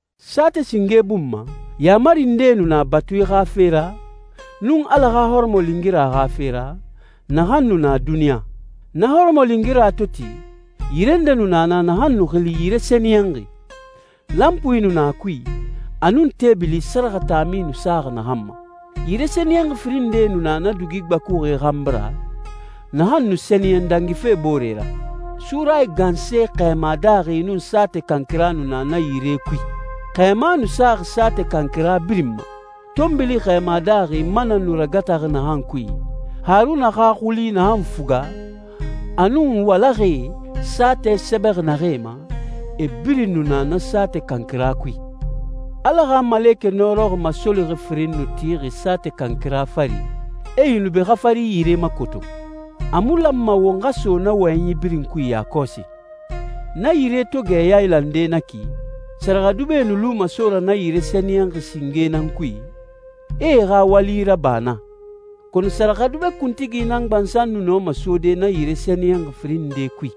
Saatɛ singe bun ma, yaamari ndee nu na batui xa fe ra, nun Ala xa hɔrɔmɔlingira xa fe ra, naxan nu na duniɲa. Na hɔrɔmɔlingira to ti, yire nde nu na naxan nu xili yire sɛniyɛnxi. Lanpui nu na a kui, a nun teebili sɛrɛxɛ taami nu saxi naxan ma. Yire sɛniyɛnxi firin nde nu na dugi gbakuxi xanbi ra, naxan nu sɛniyɛn dangife boore ra. Surayi ganse xɛɛma daaxi nun saatɛ kankira nu na na yire kui. Xɛɛma nu saxi saatɛ kankira birin ma. Tɔnbili xɛɛma daaxi mana nu ragataxi naxan kui, Haruna xa xuli naxan fuga, a nun walaxɛe, saatɛ sɛbɛxi naxee ma, e birin nu na na saatɛ kankira kui. Ala xa malekɛ nɔrɔxi masolixi firinyi nu tixi saatɛ kankira fari, e yunubi xafari yire makoto. A mu lanma won xa so na wɔyɛnyi birin kui yakɔsi. Na yire to gɛ yailande na ki, sɛrɛxɛdubɛe nu luma so ra na yire sɛniyɛnxi singe nan kui, e e xa wali raba naa. Kɔnɔ sɛrɛxɛdubɛ kuntigi nan gbansan nu nɔma sode na yire sɛniyɛnxi firin nde kui.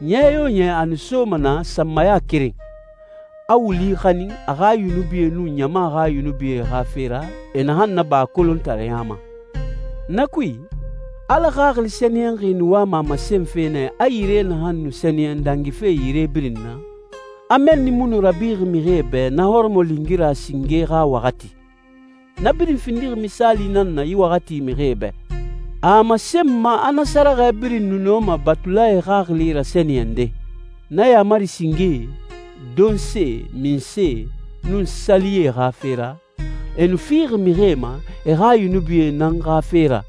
Ɲɛ yo ɲɛ a nu soma naa sanmaya keren, a wuli xanin a xa yunubie nun ɲama xa yunubie xa fe ra e naxan naba a kolontareya ma. Na kui, Ala Xaxili Sɛniyɛnxi nu wama a masenfe nɛ a yire naxan nu sɛniyɛn dangife yire birin na, a mɛnni mu nu rabixi mixie bɛ na hɔrɔmɔlingira singe xa waxati. Na birin findixi misaali nan na yi waxati mixie bɛ. A a masenma a na sɛrɛxɛ birin mu nɔma batulae xaxili rasɛniyɛnde. Na yaamari singee, donse, minse, nun sali ye xa fe ra, e nu fixi mixie ma e xa yunubie nan xa fe ra,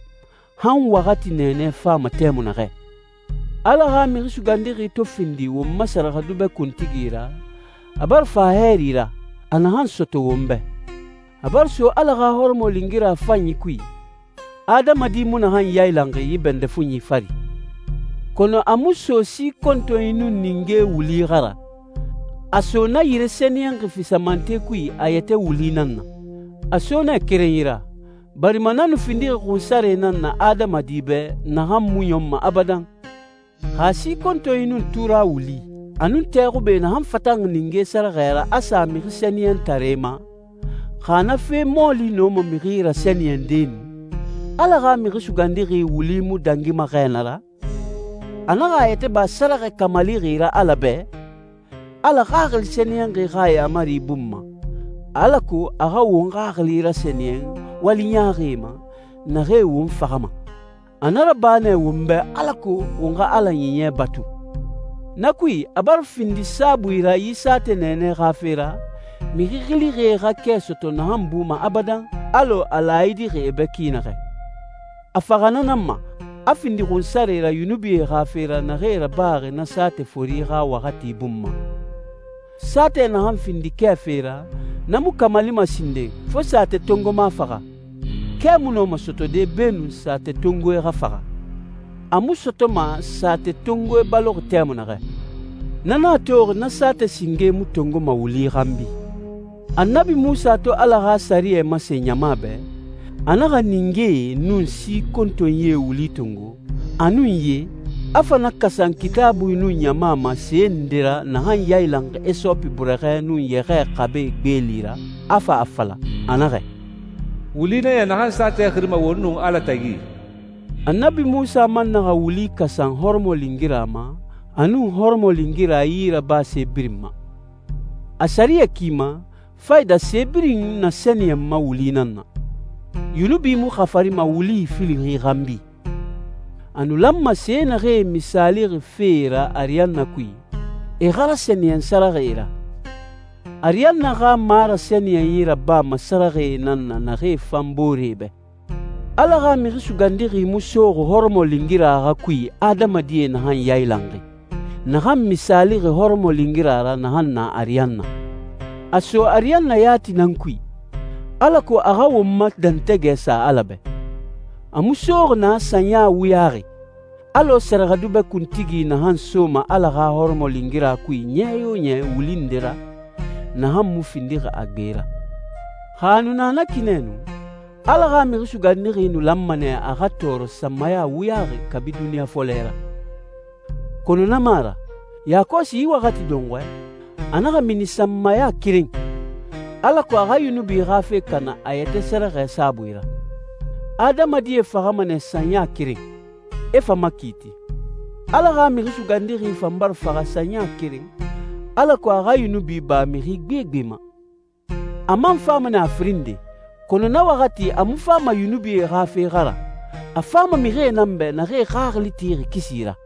han waxati nɛɛnɛ fama tɛmui naxɛ. Ala xa Mixi Sugandixi to findi won ma sɛrɛxɛdubɛ kuntigi ra, a bara fa hɛɛri ra, a naxan sɔtɔ won bɛ. A bara so Ala xa hɔrɔmɔlingira fanyi kui, adamadi mu naxan yailanxi yi bɛndɛ fuɲi fari. Kɔnɔ a mu so si kontonyi nun ninge wuli xa ra, a so na yire sɛniyɛnxi fisamante kui a yɛtɛ wuli nan na. A so nɛ kerenyi ra, barima na nu findixi xunsare nan na adamadi bɛ naxan mu ɲɔnma abadan. Xa si kontonyi nun tura wuli, a nun tɛ xube naxan fatanxi ninge sɛrɛxɛ ra a sa mixi sɛniyɛntaree ma, xa na fe mɔɔli nɔma mixi rasɛniyɛnde nu, Ala xa Mixi Sugandixi wuli mu dangima xɛ na ra? A naxa a yɛtɛ ba sɛrɛxɛ kamalixi ra Ala bɛ, Ala Xaxili Sɛniyɛnxi xa yaamari bun ma, alako a xa won xaxili rasɛniyɛn wali ɲaaxie ma, naxee won faxama. A na raba nɛ won bɛ alako won xa Ala Ɲiɲɛ batu. Na kui, a bara findi saabui ra yi saatɛ nɛɛnɛ xa fe ra, mixi xilixie xa kɛ sɔtɔ naxan buma abadan, alɔ a laayidixi e bɛ ki naxɛ. A faxa na nan ma, a findi xunsare ra yunubie xa fe ra naxee rabaxi na saatɛ fori xa waxati bun ma. Saatɛ naxan findi kɛ fe ra, na mu kamalima sinden, fo saatɛ tongoma faxa. Kɛ mu nɔma sɔtɔde beenun saatɛtongoe xa faxa. A mu sɔtɔma saatɛtongoe baloxi tɛmui naxɛ. Na nan a toxi na saatɛ singe mu tongoma wuli xanbi. Annabi Munsa to Ala xa sɛriyɛ masen ɲama bɛ, a naxa ningee nun si kontonyie wuli tongo, a nun ye, a fa na kasan Kitaabui nun ɲama ma se nde ra naxan yailanxi hisopi burɛxɛ nun yɛxɛɛ xabe gbeeli ra, a fa a fala, a naxɛ, «Wuli nan ya naxan saatɛ xirima wo nun Ala tagi.» Annabi Munsa man naxa wuli kasan hɔrɔmɔlingira ma, a nun hɔrɔmɔlingira yirabase birin ma. A sɛriyɛ ki ma, fayida se birin nasɛniyɛnma wuli nan na. Yunubi mu xafarima wuli ifili xanbi. A nu lanma se naxee misaalixi fee ra ariyanna kui, e xa rasɛniyɛn sɛrɛxɛe ra. Ariyanna xa marasɛniyɛnyi rabama sɛrɛxɛe nan na naxee fan booree bɛ. Ala xa Mixi Sugandixi mu soxi hɔrɔmɔlingira xa kui adamadie naxan yailanxi, naxan misaalixi hɔrɔmɔlingira ra naxan na ariyanna. A so ariyanna yati nan kui, alako a xa won ma dɛntɛgɛ sa Ala bɛ. A mu soxi naa sanya wuyaxi, alɔ sɛrɛxɛdubɛ kuntigi naxan soma Ala xa hɔrɔmɔlingira kui ɲɛ yo ɲɛ wuli nde ra, naxan mu findixi a gbe ra. Xa a nu na ki nɛ nu, Ala xa Mixi Sugandixi nu lanma nɛ a xa tɔɔrɔ sanmaya wuyaxi kabi duniɲa fɔlɛ ra. Kɔnɔ na mu a ra. Yakɔsi yi waxati dɔnxɔɛ, a naxa mini sanmaya keren, alako a xa yunubi xa fe kana a yɛtɛ sɛrɛxɛ saabui ra. Adamadie faxama nɛ sanya keren, e fa makiiti. Ala xa Mixi Sugandixi fan bara faxa sanmaya keren, alako a xa yunubi ba mixi gbegbe ma. A man fama nɛ a firin nde, kɔnɔ na waxati a mu fama yunubie xa fe xa ra, a fama mixie nan bɛ naxee xaxili tixi kisi ra.